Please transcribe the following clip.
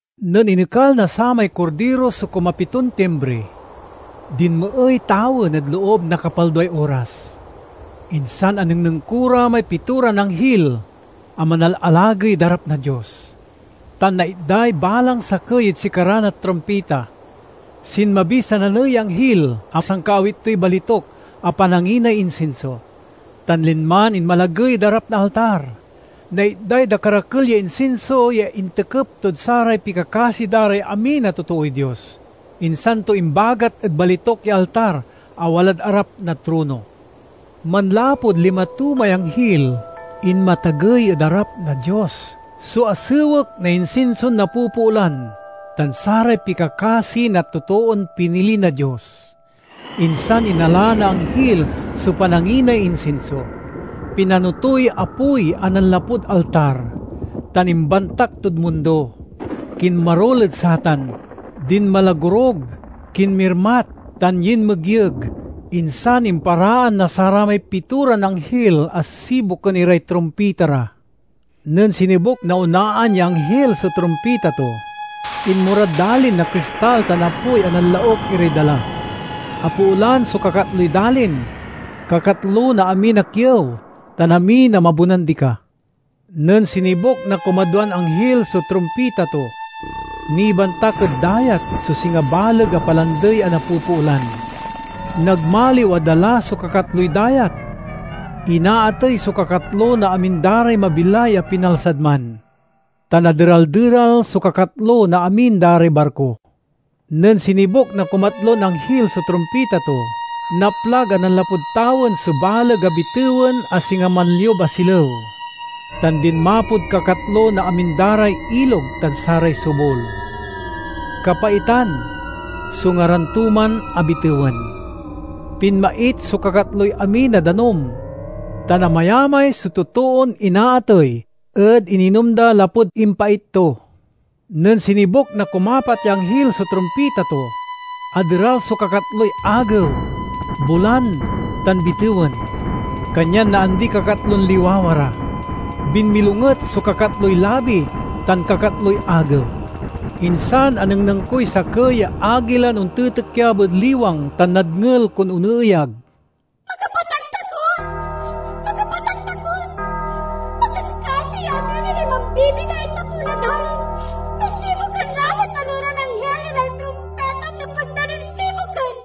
Nen inekal na samay Kordiro so kumapiton timbri, dinmeey tawen ed loob na kapalduay oras. Insan anengneng ko ra may pitoran anghil a manalalagey ed arap na Dios, tan naitday balang sakey ed sikara na trumpita. Sinmabiy sananey ya anghil a sankaawit toy balituk a pananginay insinso, tan linman inmalagey ed arap na altar. Naitday dakerakel ya insinso ya intekep tod saray pikakasi da ray amin a totooy Dios, insan to imbagat ed balituk ya altar a walad arap na trono. Manlapud lima to may anghil, inmatagey ed arap na Dios so asewek na insinson napopoolan tan saray pikakasi na totoon pinili na Dios. Insan inala na anghil so pananginay insinso, pinano toy apoy a nanlapud altar, tan imbantak tod mundo. Kinmarul ed satan, dinmalagorug, kinmirmat, tan yinmegyeg. Insan imparaan na saramay pitoran anghil a sibuken iray trumpita ra. Nen sinibuk na onaan ya anghil so trumpita to, inmorad dalin na kristal tan apoy a nanlauk iray dala. Apoolan so kakatloy dalin, kakatlo na amin a kiew, tan amin a mabonan dika. Nen sinibuk na kumadwan anghil so trumpita to, nibantak ed dayat so singa baleg a palandey a napopoolan. Nagmaliw a dala so kakatloy dayat, inaatey so kakatlo na amin da ray mabilay a pinalsad man, tan aderal-deral so kakatlo na amin da ray barko. Nen sinibuk na kumatlon anghil so trumpita to, naplag a nanlapud tawen so baleg a bitewen a singa manliub a silew, tan dinmapod kakatlo na amin da ray ilog tan saray sobul. ("Kapaitan" so ngaran to man a bitewen.) Pinmait so kakatloy amin a danum, tan amayamay so totoon inaatey ed ininom da lapud impait to. Nen sinibuk na kumapat ya anghil so trumpita to, aderal so kakatloy agew, bulan, tan bitewen, kanyan naandiy kakatlon liwawa ra. Binmilonget so kakatloy labi tan kakatloy agew. Insan anengneng koy sakey ya agilan ontitikyab ed liwang tan nadngel kon oneeyag, "Makapataktakot! Makapataktakot! Pakaskasi ya amin iray mambibilay ed tapew na dalin no sibuken la na taloran anghil iray trumpitan nepeg da nin sibuken!"